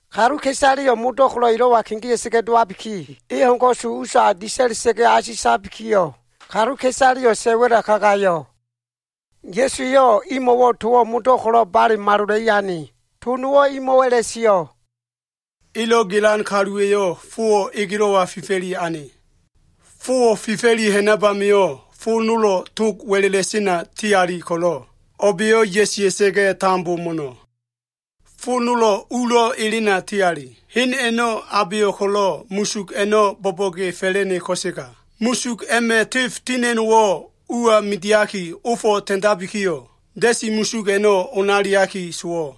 Kaluka꞉isaleyo꞉ modo꞉ ko꞉lo꞉ elo꞉wa kegea꞉sa꞉ga꞉ dowabiki, e ho꞉n ko꞉su usa disa꞉la꞉sa꞉ga꞉ asitabikiyo꞉, kaluka꞉isaleyo꞉ sa꞉ wa꞉la kagayo꞉. Ya꞉su eyo꞉ imo꞉wo꞉ towo꞉ modo꞉ ko꞉lo꞉ bale malola꞉i ane. To nowo꞉ eyo꞉ imo꞉ a꞉la꞉sio꞉, “Elo꞉ gelan kaluwa꞉yo꞉ fowo꞉ egelo꞉wa fifa꞉li ane. E fowo꞉ fifa꞉li ha꞉nab amio꞉, fo nolo꞉ tog wa꞉la꞉la꞉sena tiali ko꞉lo꞉, o꞉ba꞉yo꞉ ya꞉sia꞉sa꞉ga꞉ tambo mo꞉no꞉ Fo nolo꞉ ulo꞉ elena ti ali. Hen a꞉no꞉ abeyo꞉ ko꞉lo꞉ musug a꞉no꞉ bo꞉bo꞉ge fa꞉la꞉ne ko꞉sega, musug a꞉ma꞉ tef tina꞉no꞉wo꞉ uwa midiaki, ofo꞉ ta꞉ndabikiyo꞉, da꞉si musug a꞉no꞉ onaliaki sowo꞉.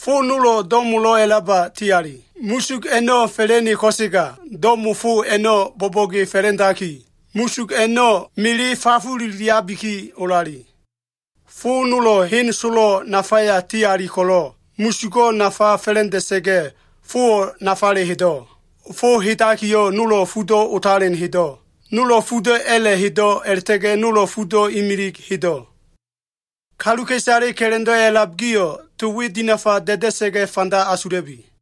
Fo nolo꞉ do꞉molo꞉ a꞉laba ti ali. Musug a꞉no꞉ fa꞉la꞉ne ko꞉sega, do꞉mo fo a꞉no꞉ bo꞉bo꞉ge fa꞉la꞉ndaki, musug a꞉no꞉ mele fafululiabiki olali. Fo nolo꞉ hen solo꞉ nafaya ti ali ko꞉lo꞉, musugo꞉ nafa fa꞉la꞉nda꞉sa꞉ga꞉, fowo꞉ nafale hedo꞉. Fo hedakiyo꞉, nolo꞉ fudo꞉ otalen hedo꞉, nolo꞉ fudo꞉ a꞉la꞉ hedo꞉, a꞉la꞉ta꞉ga꞉ nolo꞉ fudo꞉ imilig hedo꞉. Kaluka꞉isale ka꞉la꞉ndo꞉ a꞉lab gio꞉, to we dinafa da꞉da꞉sa꞉ga꞉ fanda asula꞉bi.”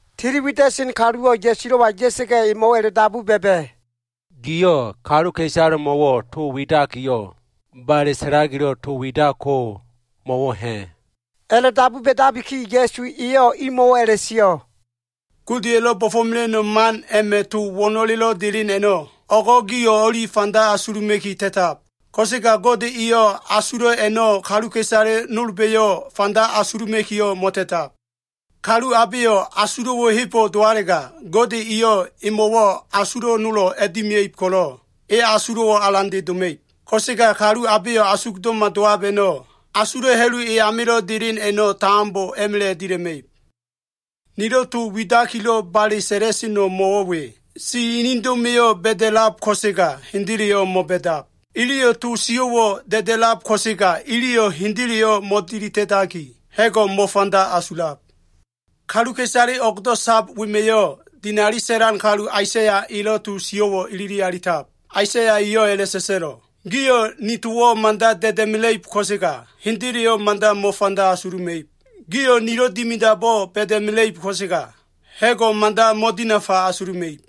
Tiliwida꞉sen kaluwo꞉ Ya꞉sulo꞉wa ya꞉sa꞉ga꞉, emo꞉wo꞉ a꞉la꞉dabu ba꞉ba꞉, “Giyo꞉ kaluka꞉isalemo꞉wo꞉ to widakiyo꞉, bale sa꞉lakilo꞉ to widako mo꞉wo꞉ ha꞉?” A꞉la꞉dabu ba꞉dabiki, Ya꞉su eyo꞉ imo꞉wo꞉ a꞉la꞉sio꞉, “Godeya꞉lo꞉ bo꞉fo꞉mela꞉no꞉ man a꞉ma꞉ to wo꞉no꞉le delen a꞉no꞉, o꞉go꞉ gio꞉ o꞉li fanda asuluma꞉ki ta꞉tab. Ko꞉sega Gode eyo꞉ asulo꞉ a꞉no꞉ kaluka꞉isale nolba꞉yo꞉ fanda asuluma꞉kiyo꞉, mo꞉ta꞉tab. Kalu abeyo꞉ asulo꞉wo꞉ hebo꞉ dowalega, Gode eyo꞉ emo꞉wo꞉ asulo꞉ nolo꞉ a꞉dimia꞉ib ko꞉lo꞉, e asulo꞉wo꞉ alande doma꞉ib. Ko꞉sega kalu abeyo꞉ asugdo꞉ma dowab a꞉no꞉, asulo꞉ ha꞉lu e amilo꞉ delen a꞉no꞉, tambo a꞉ma꞉la꞉ dila꞉ma꞉ib. Nilo꞉ to widakilo꞉ bale sa꞉la꞉seno꞉ mo꞉wo꞉ we. Si inido꞉ma꞉yo꞉ ba꞉da꞉lab ko꞉sega, hendeleyo꞉ mo꞉ba꞉dab. Iliyo꞉ to sio꞉wo꞉ da꞉da꞉lab ko꞉sega, iliyo꞉ hendeleyo꞉ mo꞉tilida꞉daki, ha꞉go꞉ mo꞉fanda asulab. Kaluka꞉isale o꞉gdo꞉ sab wema꞉yo꞉, dinali sa꞉lan kalu Aisaya elo꞉ to sio꞉wo꞉ ilili alitab. Aisaya eyo꞉ a꞉la꞉sa꞉sa꞉lo꞉, “ ‘Gio꞉ ni towo꞉ mada da꞉da꞉mela꞉ib ko꞉sega, hendeleyo꞉ mada mo꞉fanda asuluma꞉ib. Gio꞉ nilo꞉ dimidabo꞉ ba꞉da꞉mela꞉ib ko꞉sega, ha꞉go꞉ mada mo꞉dinafa asuluma꞉ib.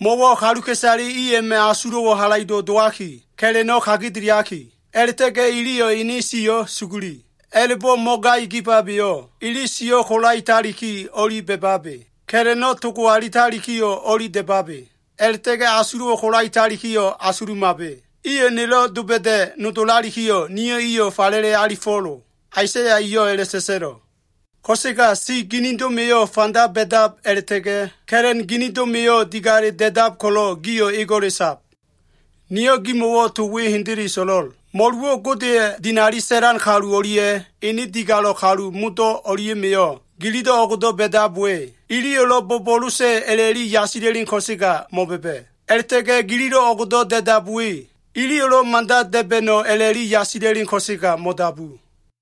Mo꞉wo꞉ kaluka꞉isale i a꞉ma꞉ asulo꞉wo꞉ halaido꞉ dowaki, ka꞉la꞉no꞉ kagedeliaki, a꞉la꞉ta꞉ga꞉ iliyo꞉ ini siyo꞉ suguli. A꞉la꞉bo꞉ mo꞉ngai kibabeyo꞉, ili siyo꞉ kolaetaliki o꞉li ba꞉babe, ka꞉la꞉no꞉ togo alitaliki o꞉li da꞉babe, a꞉la꞉ta꞉ga꞉ asulo꞉wo꞉ kolaetaliki o꞉li asulumabe. Iyo꞉ nelo꞉ doba꞉da꞉ nodolalikiyo꞉, niyo꞉ iyo꞉ falele alifo꞉lo.’ Aisaya eyo꞉ a꞉la꞉sa꞉sa꞉lo꞉. Ko꞉sega si ginido꞉ma꞉yo꞉ fanda ba꞉dab a꞉la꞉ta꞉ga꞉, ka꞉la꞉n ginido꞉ma꞉yo꞉ digale da꞉dab ko꞉lo꞉ gio꞉ ego꞉le sab. Niyo꞉ gimo꞉wo꞉ to we hendele so꞉lo꞉l. Mo꞉luwo꞉ Godeya꞉ dinali sa꞉lan kalu o꞉lia꞉ ene digalo꞉ kalu modo꞉ o꞉lia꞉ma꞉yo꞉, gililo꞉ o꞉go꞉do꞉ ba꞉dab we, iliyo꞉lo꞉ bo꞉bo꞉losa꞉ a꞉la꞉li yasila꞉len ko꞉sega mo꞉ba꞉ba꞉. A꞉la꞉ta꞉ga꞉ gililo꞉ o꞉gdo꞉ da꞉dab we iliyo꞉lo꞉ mada da꞉ba꞉no꞉ a꞉la꞉li yasila꞉len ko꞉sega mo꞉dabu.”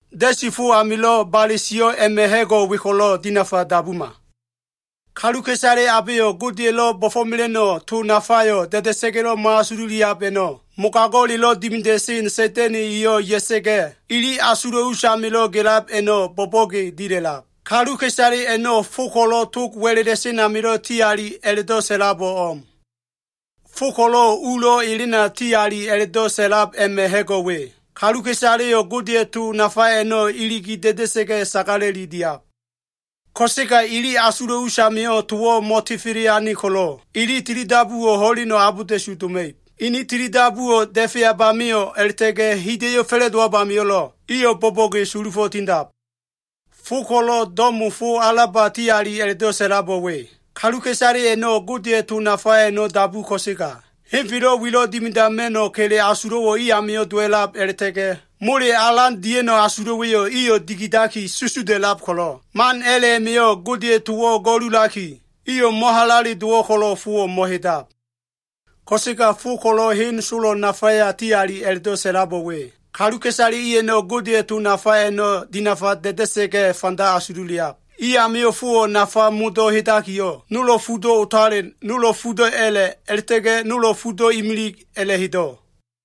“Da꞉si fo amilo꞉ bale sio꞉ a꞉ma꞉ ha꞉go꞉ we ko꞉lo꞉ dinafa dabuma. Kaluka꞉isale abeyo꞉ Godeya꞉lo꞉ bo꞉fo꞉mela꞉no꞉ to nafayo꞉ da꞉da꞉sa꞉ga꞉lo꞉ mo꞉fanda asululiab a꞉no꞉, mogago꞉lelo꞉ dimida꞉sen Sa꞉da꞉na꞉ eyo꞉ ya꞉sa꞉ga꞉, ili asulo꞉ usamilo꞉ gelab a꞉no꞉ bo꞉bo꞉ge dila꞉lab. Kaluka꞉isale a꞉no꞉ fo ko꞉lo꞉ tog wa꞉la꞉la꞉sen amilo꞉ ti ali a꞉la꞉do꞉ sa꞉labo꞉ o꞉m. Fo ko꞉lo꞉ ulo꞉ elena ti ali a꞉la꞉do꞉ sa꞉lab a꞉ma꞉ ha꞉go꞉ we. Kaluka꞉isaleyo꞉ Godeya꞉ to nafa a꞉no꞉ iligi da꞉da꞉sa꞉ga꞉, sagala꞉li diab. Ko꞉sega ili asulo꞉ us amio꞉ towo꞉ mo꞉tefele ane ko꞉lo꞉, ili tilidabuwo꞉ ho꞉len abolda꞉su doma꞉ib. Ini tilidabuwo꞉ da꞉feab amio꞉ a꞉la꞉ta꞉ga꞉ hida꞉yo꞉ fa꞉la꞉dowab amio꞉lo꞉, iyo꞉ bo꞉bo꞉ge sulufo꞉ tindab. Fo ko꞉lo꞉ do꞉mo fo alaba ti ali a꞉la꞉do꞉ sa꞉labo꞉ we. Kaluka꞉isale a꞉no꞉ Godeya꞉ to nafa a꞉no꞉ dabu ko꞉sega, henfelo꞉ wilo꞉ dimidama꞉no꞉ kele asulo꞉wo꞉ i amio꞉ dowa꞉lab a꞉la꞉ta꞉ga꞉ mole alan dia꞉no꞉ asulo꞉wa꞉yo꞉ iyo꞉ dikidaki susuda꞉lab ko꞉lo꞉, man a꞉la꞉ a꞉ma꞉yo꞉ Godeya꞉ towo꞉ go꞉lulaki, iyo꞉ mo꞉halale dowo꞉ ko꞉lo꞉ fowo꞉ mo꞉hedab. Ko꞉sega fo ko꞉lo꞉ hen solo꞉ nafaya ti ali a꞉la꞉do꞉ sa꞉labo꞉ we. Kaluka꞉isale i a꞉no꞉ Godeya꞉ to nafa a꞉no꞉ dinafa da꞉da꞉sa꞉ga꞉ fanda asululiab. I amio꞉ fowo꞉ nafa modo꞉ hedakiyo꞉, nolo꞉ fudo꞉ otalen, nolo꞉ fudo꞉ a꞉la꞉, a꞉la꞉ta꞉ga꞉ nolo꞉ fudo꞉ imilig a꞉la꞉hedo꞉.”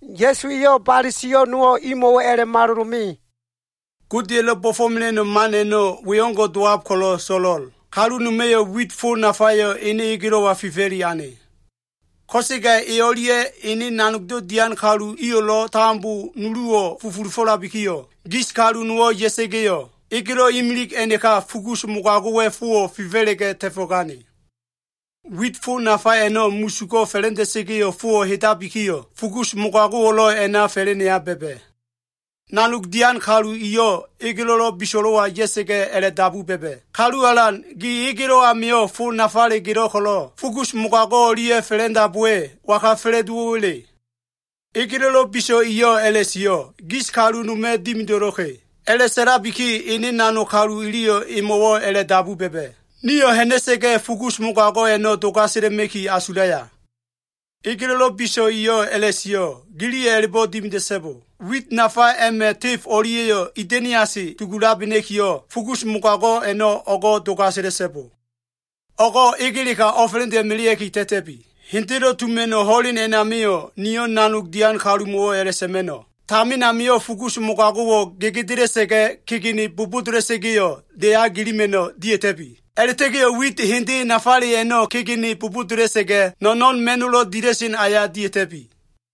Ya꞉su eyo꞉ bale sio꞉ nowo꞉ imo꞉wo꞉ a꞉la꞉malolo꞉ me. “Godeya꞉lo꞉ bo꞉fo꞉mela꞉no꞉ man a꞉no꞉, we o꞉ngo꞉ dowab ko꞉lo꞉ so꞉lo꞉l. Kalu noma꞉yo꞉ wit fo nafayo꞉ ene egelo꞉wa fifa꞉li ane. Ko꞉sega e o꞉lia꞉ ene nanogdo꞉ dian kalu iyo꞉lo꞉ tambo nuluwo꞉ fufulufo꞉labikiyo꞉, gis kalu nowo꞉ ya꞉sa꞉ga꞉yo꞉, egelo꞉ imilig a꞉naka fugus mogago꞉wa꞉ fowo꞉ fifa꞉la꞉ga꞉ ta꞉fo꞉gane. Wit fo nafa a꞉no꞉ musugo꞉ fa꞉la꞉nda꞉sa꞉ga꞉yo꞉ fowo꞉ hedabikiyo꞉, fugus mogago꞉wo꞉lo꞉ a꞉naka fa꞉la꞉neya ba꞉ba꞉. Nanog dian kalu iyo꞉ egelo꞉lo꞉ biso꞉lo꞉wa ya꞉sa꞉ga꞉, a꞉la꞉dabu ba꞉ba꞉, ‘Kalu alan, gi egelo꞉ amio꞉ fo nafale gelo꞉ ko꞉lo꞉, fugus mogago꞉ o꞉lia꞉ a꞉fa꞉la꞉ndab we, waga fa꞉la꞉dowo꞉wa꞉le?’ Egelo꞉lo꞉ biso꞉ eyo꞉ a꞉la꞉sio꞉, ‘Gis kalu noma꞉ dimido꞉lo꞉ka꞉.’ A꞉la꞉sa꞉labiki, ene nanog kalu iliyo꞉ emo꞉wo꞉ a꞉la꞉dabu ba꞉ba꞉, ‘Nio꞉ ha꞉na꞉sa꞉ga꞉ fugus mogago꞉ a꞉no꞉ dogasela꞉ma꞉ki asulaya?’ Egelo꞉lo꞉ biso꞉ eyo꞉ a꞉la꞉sio꞉, ‘Giliyo꞉ a꞉la꞉bo꞉ dimida꞉so꞉bo. Wit nafa a꞉ma꞉ tef o꞉lia꞉yo꞉ ida꞉niase dugulabena꞉kiyo꞉, fugus mogago꞉ a꞉no꞉ o꞉go꞉ dogasela꞉so꞉bo. O꞉go꞉ egeleka o꞉fa꞉la꞉nda꞉melea꞉ki ta꞉ta꞉bi. Hendelo꞉ tuma꞉no꞉ ho꞉len a꞉namio꞉, niyo꞉ nanog dian kalumo꞉wo꞉ a꞉la꞉sa꞉ma꞉no꞉, “Tamin amio꞉ fugus mogago꞉wo꞉ gegedela꞉sa꞉ga꞉, kegene bobodola꞉sa꞉ga꞉yo꞉, deya gilima꞉no꞉ dia꞉ta꞉bi. A꞉la꞉ta꞉ga꞉yo꞉ wit hende nafale a꞉no꞉ kegene bobodola꞉sa꞉ga꞉, no꞉no꞉n ma꞉no꞉lo꞉ dila꞉sen aya dia꞉ta꞉bi.”’”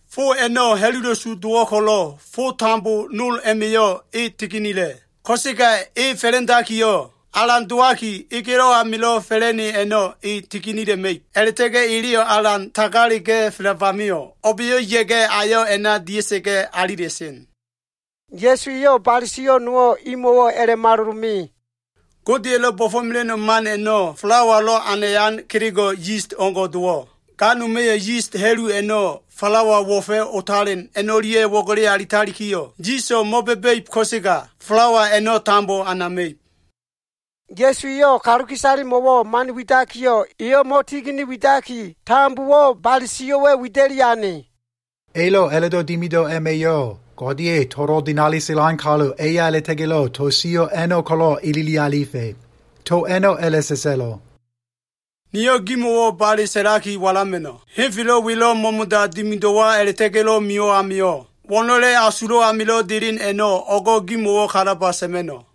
Fo a꞉no꞉ ha꞉lula꞉su dowo꞉ ko꞉lo꞉, fo tambo nol a꞉ma꞉yo꞉ e tiginila꞉. Ko꞉sega e fa꞉la꞉ndakiyo꞉, alan dowaki egelo꞉ amilo꞉ fa꞉la꞉ne a꞉no꞉ e tiginila꞉ma꞉ib. A꞉la꞉ta꞉ga꞉ eleyo꞉ alan tagalega꞉felab amio꞉, o꞉ba꞉yo꞉ ya꞉ga꞉ ayo꞉ a꞉na dia꞉sa꞉ga꞉ alila꞉sen.” Ya꞉su eyo꞉ bale sio꞉ nowo꞉ imo꞉wo꞉ a꞉la꞉malolo꞉ me. “Godeya꞉lo꞉ bo꞉fo꞉mela꞉no꞉ man a꞉no꞉ falawalo꞉ anayan kelego꞉ yis o꞉ngo꞉ dowo꞉. Ga noma꞉yo꞉ yis ha꞉lu a꞉no꞉ falawa wo꞉fa꞉ otalen a꞉no꞉lia꞉ wo꞉gele alitalikiyo꞉, yiso꞉ mo꞉ba꞉ba꞉ib ko꞉sega falawa a꞉no꞉ tambo anama꞉ib.” Ya꞉su eyo꞉ kaluka꞉isalemo꞉wo꞉ man widakiyo꞉, eyo꞉ mo꞉tigini widaki, tambowo꞉ bale sio꞉wa꞉ wida꞉li ane. Elo꞉ a꞉la꞉do꞉ dimido꞉ a꞉ma꞉yo꞉, Godeya꞉ tolo꞉ dinali sa꞉lan kalu eya a꞉la꞉ta꞉ga꞉lo꞉ to sio꞉ a꞉no꞉ ko꞉lo꞉ ilili alifa꞉. To a꞉no꞉ a꞉la꞉sa꞉sa꞉lo꞉, “Niyo꞉ gimo꞉wo꞉ bale sa꞉laki walama꞉no꞉. Henfelo꞉ welo꞉ mo꞉mo꞉da dimido꞉wa a꞉la꞉ta꞉ga꞉lo꞉ mio꞉ amio꞉, wo꞉no꞉le asulo꞉ amilo꞉ delen a꞉no꞉ o꞉go꞉ gimo꞉wo꞉ kalaba sa꞉ma꞉no꞉.”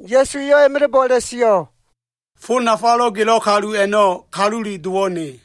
Ya꞉su eyo꞉ a꞉ma꞉la꞉bo꞉ a꞉la꞉sio꞉, “Fo nafalo꞉ gelo꞉ kalu a꞉no꞉, Kalule Dowo꞉ ne.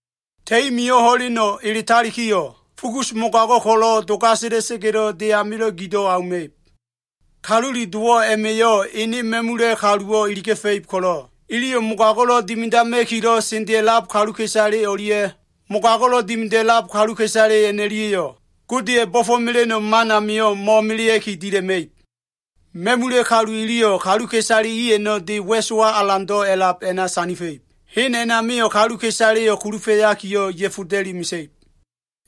Ta꞉i mio꞉ ho꞉leno꞉ eletalikiyo꞉, fugus mogago꞉ ko꞉lo꞉ dogasela꞉sa꞉ga꞉lo꞉ de amilo꞉ gido꞉ auma꞉ib. Kalule Dowo꞉ a꞉ma꞉yo꞉ ene ma꞉mula꞉ kaluwo꞉ iliga꞉fa꞉ib ko꞉lo꞉, iliyo꞉ mogago꞉lo꞉ dimidama꞉kilo꞉ sendea꞉lab kaluka꞉isale o꞉lia꞉ mogago꞉lo꞉ dimida꞉lab kaluka꞉isale a꞉no꞉lia꞉yo꞉, Godeya꞉ bo꞉fo꞉mela꞉no꞉ man amio꞉ mo꞉melea꞉ki dila꞉ma꞉ib. Ma꞉mula꞉ kalu iliyo꞉ kaluka꞉isale i a꞉no꞉ de wa꞉sowa alando꞉ a꞉lab a꞉na sandifa꞉ib. Hen a꞉namio꞉ kaluka꞉isaleyo꞉ kulufa꞉yakiyo꞉, ya꞉foda꞉li mesa꞉ib.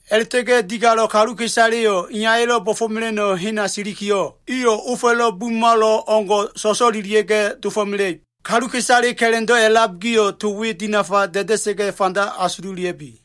A꞉la꞉ta꞉ga꞉ digalo꞉ kaluka꞉isaleyo꞉, Iyaya꞉lo꞉ bo꞉fo꞉mela꞉no꞉ hena silikiyo꞉, iyo꞉ ofa꞉lo꞉ bumalo꞉ o꞉ngo꞉ so꞉so꞉lelia꞉ga꞉ dofo꞉mela꞉ib. Kaluka꞉isale ka꞉la꞉ndo꞉ a꞉lab gio꞉, to we dinafa da꞉da꞉sa꞉ga꞉ fanda asula꞉bi.”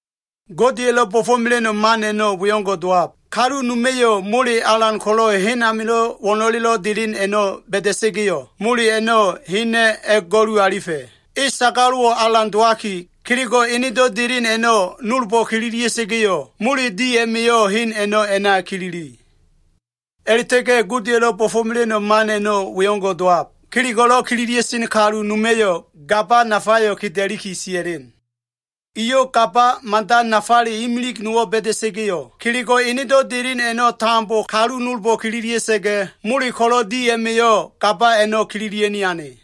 “Godeya꞉lo꞉ bo꞉fo꞉mela꞉no꞉ man a꞉no꞉ we o꞉ngo꞉ dowab. Kalu noma꞉yo꞉ mole alan ko꞉lo꞉ hen amilo꞉ wo꞉no꞉lelo꞉ delen a꞉no꞉ ba꞉da꞉sa꞉ga꞉yo꞉, mole a꞉no꞉ hena꞉ a꞉go꞉lu alifa꞉. E sagalo꞉wo꞉ alan dowaki, kelego꞉ enedo꞉ delen a꞉no꞉ nolbo꞉ kililia꞉sa꞉ga꞉yo꞉, mole di a꞉ma꞉yo꞉ hen a꞉no꞉ a꞉na a꞉kilili. “A꞉la꞉ta꞉ga꞉ Godeya꞉lo꞉ bo꞉fo꞉mela꞉no꞉ man a꞉no꞉ we o꞉ngo꞉ dowab. Kelego꞉lo꞉ kililia꞉sen kalu noma꞉yo꞉ gaba nafayo꞉ keda꞉liki sia꞉len. Eyo꞉ gaba mada nafale imilig nowo꞉ ba꞉da꞉sa꞉ga꞉yo꞉, kelego꞉ enedo꞉ delen a꞉no꞉ tambo kalu nolbo꞉ kililia꞉sa꞉ga꞉, mole ko꞉lo꞉ di a꞉ma꞉yo꞉ gaba a꞉no꞉ kililia꞉ni ane.”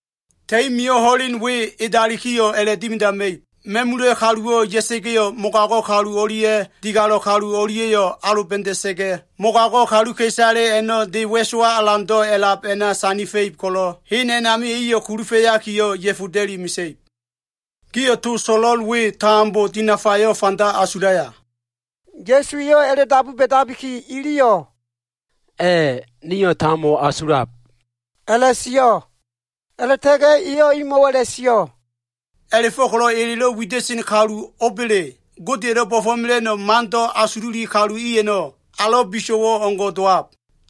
Ta꞉i mio꞉ ho꞉len we edalikiyo꞉, a꞉la꞉dimidama꞉ib. Ma꞉mula꞉ kaluwo꞉ ya꞉sa꞉ga꞉yo꞉, mogago꞉ kalu o꞉lia꞉ digalo꞉ kalu o꞉lia꞉yo꞉ aloba꞉da꞉sa꞉ga꞉, mogago꞉ kaluka꞉isale a꞉no꞉ de wa꞉sowa alando꞉ a꞉lab a꞉na sandifa꞉ib ko꞉lo꞉, hen a꞉namio꞉ iyo꞉ kulufa꞉yakiyo꞉, ya꞉foda꞉li mesa꞉ib. “Gio꞉ to so꞉lo꞉l we tambo dinafayo꞉ fanda asulaya?” Ya꞉su eyo꞉ a꞉la꞉dabu ba꞉dabiki, iliyo꞉, “A꞉ nio꞉ tambo asulab,” a꞉la꞉sio꞉. A꞉la꞉ta꞉ga꞉ eyo꞉ imo꞉wo꞉ a꞉la꞉sio꞉, “A꞉la꞉go꞉ko꞉lo꞉ elelo꞉ wida꞉sen kalu o꞉ba꞉le, Godeya꞉lo꞉ bo꞉fo꞉mela꞉no꞉ mando꞉ asululi kalu i a꞉no꞉, alo꞉ biso꞉wo꞉ o꞉ngo꞉ dowab.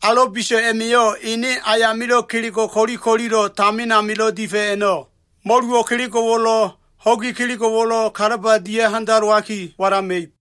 Alo꞉ biso꞉ a꞉ma꞉yo꞉, ene ayamilo꞉ kelego꞉ ko꞉li ko꞉lilo꞉ tamin amilo꞉ difa꞉ a꞉no꞉, mo꞉luwo꞉ kelego꞉wo꞉lo꞉, ho꞉gi kelego꞉wo꞉lo꞉ kalaba dia꞉ handalowaki walama꞉ib.”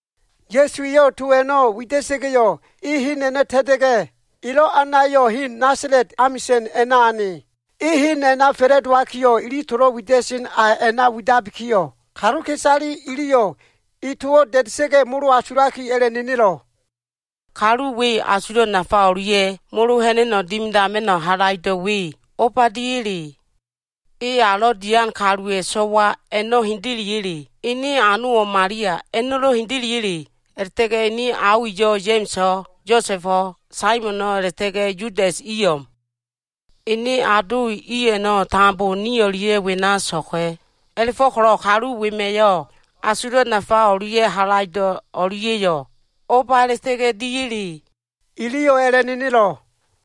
Ya꞉su eyo꞉ to a꞉no꞉ wida꞉sa꞉ga꞉yo꞉, e hen a꞉no꞉ ta꞉ta꞉ga꞉, elo꞉ anayo꞉ hen, Nasala꞉t amisa꞉n a꞉na ane. E hen a꞉na fa꞉la꞉dowakiyo꞉, ili tolo꞉ wida꞉sen a a꞉na widabikiyo꞉, kaluka꞉isale iliyo꞉ e towo꞉ da꞉da꞉sa꞉ga꞉, molo asulaki, a꞉la꞉nenelo꞉. “Kalu we asulo꞉ nafa o꞉lia꞉ molo ha꞉na꞉no꞉ dimidama꞉no꞉ halaido꞉ we o꞉ba diya꞉le? E alo꞉ dian kaluwa꞉ so꞉wa, a꞉no꞉ hendeleya꞉le? Ene anowo꞉ Malia, a꞉no꞉lo꞉ hendeleya꞉le? A꞉la꞉ta꞉ga꞉ ene ao iyo꞉ Ya꞉ma꞉so꞉, Yosa꞉bo꞉, Saimono꞉ a꞉la꞉ta꞉ga꞉ Yudas i o꞉m. Ene ado i a꞉no꞉ tambo ni o꞉lia꞉ wena so꞉lka꞉. A꞉la꞉fo꞉ko꞉lo꞉ kalu wema꞉yo꞉ asulo꞉ nafa o꞉lia꞉ halaido꞉ a꞉no꞉lia꞉yo꞉ o꞉ba a꞉la꞉ta꞉ga꞉ diya꞉le?” Iliyo꞉ a꞉la꞉nenelo꞉.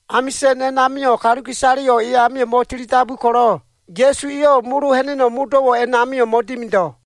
Amisa꞉n a꞉namio꞉ kaluka꞉isaleyo꞉ e amio꞉ mo꞉tilidabu ko꞉lo꞉, Ya꞉su eyo꞉ molo ha꞉na꞉no꞉ modo꞉wo꞉ a꞉namio꞉ mo꞉dimido꞉.